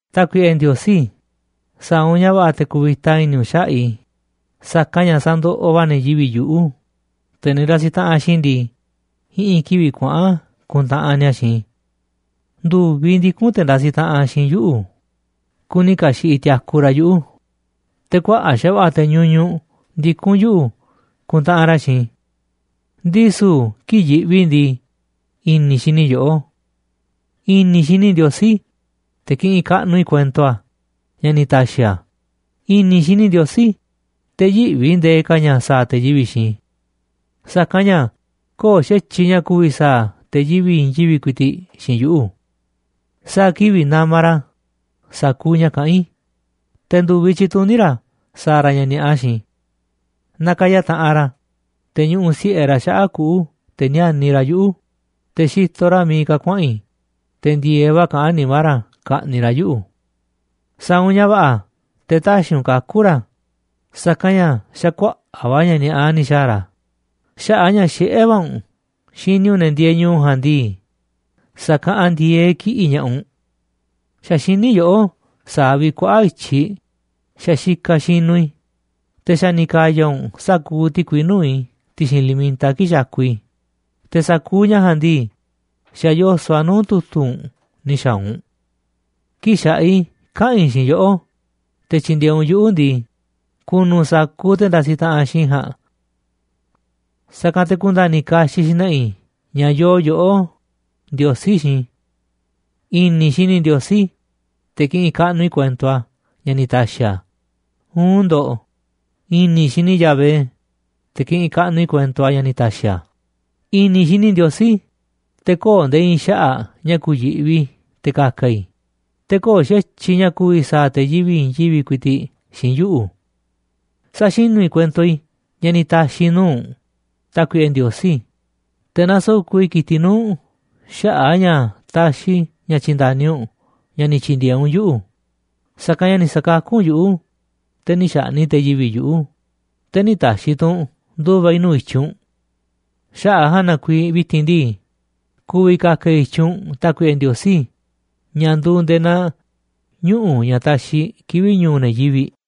Tákuiꞌe Ndiosí, sa̱a̱ u̱nꞌ ña̱ va̱ꞌa̱ te̱ ku̱vi̱ta i̱ni̱ u̱nꞌ xaꞌa̱ꞌ i̱, sa̱kanꞌ ña̱ sandoꞌoꞌ va̱ ne̱ yivi̱ꞌ yuꞌu̱, te̱ ne̱ ndasiꞌ taꞌanꞌ xiinꞌ i̱ ndii, i̱ꞌi̱n kivi̱ꞌ kuaꞌa̱n kuntaꞌanꞌ ni̱a̱ xiinꞌ i̱. Ndu̱viꞌ ndikún te̱ ndasiꞌ taꞌanꞌ xiinꞌ i̱ yuꞌu̱, kuni ka̱xi̱ꞌiꞌ tiaku ra̱ yuꞌu̱, te̱ kuaꞌa̱ꞌ xa̱va̱ꞌa̱ te̱ ñuñuꞌ ndikún yuꞌu̱ kuntaꞌanꞌ ra̱ xiinꞌ i̱. Ndisu̱ kii̱ꞌ yiꞌvi i̱ ndii, i̱ni̱ i̱ xini yoꞌó. I̱ni̱ i̱ xini i̱ Ndiosí, te̱ kiꞌinꞌ kaꞌnuꞌ i̱ kuento a̱ ña̱ ni̱ ta̱xi̱ a̱, i̱ni̱ xini i̱ Ndiosí, te̱ yïꞌvi i̱ ndee ka̱ ña̱ sa̱a̱ te̱ yivi̱ꞌ xiinꞌ i̱. Sa̱kanꞌ ña̱ köo̱ꞌ xa̱tyiꞌ ña̱ ku̱vi̱ sa̱a̱ te̱ yivi̱ꞌ i̱i̱n yivi̱ꞌ ku̱i̱ti̱ꞌ xiinꞌ yuꞌu̱. Sa̱a̱ kivi̱ꞌ namaꞌ ra̱ sa̱kuuꞌ ña̱ kaꞌán i̱, te̱ ndu̱viꞌ tyituní ra̱ sa̱a̱ ra̱ ña̱ ni̱a̱ꞌa xiinꞌ i̱. Nakaya taꞌanꞌ ra̱, te̱ ñuꞌuꞌ si̱ꞌe ra̱ xaꞌa̱ꞌ kuꞌu̱ te̱ níániꞌ ra̱ yuꞌu̱, te̱ xitoꞌ ra̱ miiꞌ ka̱ kuaꞌa̱n i̱, te̱ ndi̱e̱eꞌ va̱ kaꞌán nimá ra̱ ka̱ꞌni̱ꞌ ra̱ yuꞌu̱. Sa̱a̱ u̱nꞌ ña̱ va̱ꞌa̱ te̱ tä̱xi̱ u̱nꞌ kaku̱ ra̱, sa̱kanꞌ ña̱ xa̱ kuaꞌa̱ꞌ va̱ ña̱ ni̱a̱ꞌa ni̱ xa̱a̱ ra̱, xaꞌa̱ꞌ a̱ ña̱ xiꞌé va̱ u̱nꞌ xini u̱nꞌ ne̱ ndieeꞌ ñu̱u̱ ja̱a̱nꞌ ndii, sa̱kaꞌanꞌ ndi̱e̱eꞌ kiꞌi̱ꞌ ña̱ꞌaꞌ u̱nꞌ. Xa̱ xiní yoꞌó sa̱a̱ vi̱ꞌ kuaꞌa̱ꞌ i̱tyiꞌ xa̱ xikaꞌ xinuꞌ i̱, te̱ xa̱ ni̱ ka̱ya̱ u̱nꞌ sa̱kuuꞌ ti̱kui nuu̱ꞌ i̱ ti̱xi̱n li̱mita kii̱ꞌ xakuꞌ i̱, te̱ sa̱kuuꞌ ña̱ ja̱a̱nꞌ ndii, xa̱ yoso̱ꞌ a̱ nuu̱ꞌ tu̱tu̱ u̱nꞌ ni̱ xa̱a̱ u̱nꞌ. Kii̱ꞌ xa̱ꞌaꞌ i̱ kaꞌa̱n i̱ xiinꞌ yoꞌó te̱ tyi̱ndi̱e̱eꞌ u̱nꞌ yuꞌu̱ ndii, ku̱nu̱ sa̱kuuꞌ te̱ ndasiꞌ taꞌanꞌ xiinꞌ i̱ ja̱a̱nꞌ. Sa̱kanꞌ te̱ ku̱nda̱ni̱ kaxiꞌ xna̱ꞌa̱ i̱ ña̱ yoo yoꞌó, Ndiosí, xiinꞌ i̱. I̱ni̱ i̱ xini i̱ Ndiosí, te̱ kiꞌinꞌ kaꞌnuꞌ i̱ kuento a̱ ña̱ ni̱ ta̱xi̱ a̱, uun ndo̱ꞌ, i̱ni̱ xini i̱ Yahvé, te̱ kiꞌinꞌ kaꞌnuꞌ i̱ kuento a̱ ña̱ ni̱ ta̱xi̱ a̱. I̱ni̱ i̱ xini i̱ Ndiosí, te̱ köo̱ꞌ nde̱e̱ i̱i̱n xaꞌa̱ꞌ ña̱ ku̱yi̱ꞌvi i̱ te̱ ka̱ka̱ i̱, te̱ köo̱ꞌ xa̱tyiꞌ ña̱ ku̱vi̱ sa̱a̱ te̱ yivi̱ꞌ i̱i̱n yivi̱ꞌ ku̱i̱ti̱ꞌ xiinꞌ yuꞌu̱. Saxinú i̱ kuento i̱ ña̱ ni̱ ta̱xi̱ i̱ nuu̱ꞌ u̱nꞌ, Tákuiꞌe Ndiosí, te̱ na̱soko̱ꞌ i̱ ki̱tiꞌ nuu̱ꞌ u̱nꞌ xaꞌa̱ꞌ a̱ ña̱ taxiꞌ i̱ ña̱ tyi̱nda̱ni u̱nꞌ ña̱ ni̱ tyi̱ndi̱e̱eꞌ u̱nꞌ yuꞌu̱. Sa̱kanꞌ ña̱ ni̱ sa̱kakú u̱nꞌ yuꞌu̱, te̱ nï̱ xa̱ꞌni̱ꞌ te̱ yivi̱ꞌ yuꞌu̱, te̱ nï̱ ta̱xi̱ tu̱ u̱nꞌ ndu̱va̱ i̱ nuu̱ꞌ i̱tyiꞌ u̱nꞌ. Xaꞌa̱ꞌ a̱ ja̱a̱nꞌ na kuiiꞌ vi̱ti̱n ndii, ku̱vi̱ ka̱ka̱ i̱ i̱tyiꞌ u̱nꞌ, Tákuiꞌe Ndiosí, ña̱ nduuꞌ nde̱e̱ naa ñuꞌu̱ ña̱ taxiꞌ kivi̱ꞌ ñu̱u̱ ne̱ yivi̱ꞌ.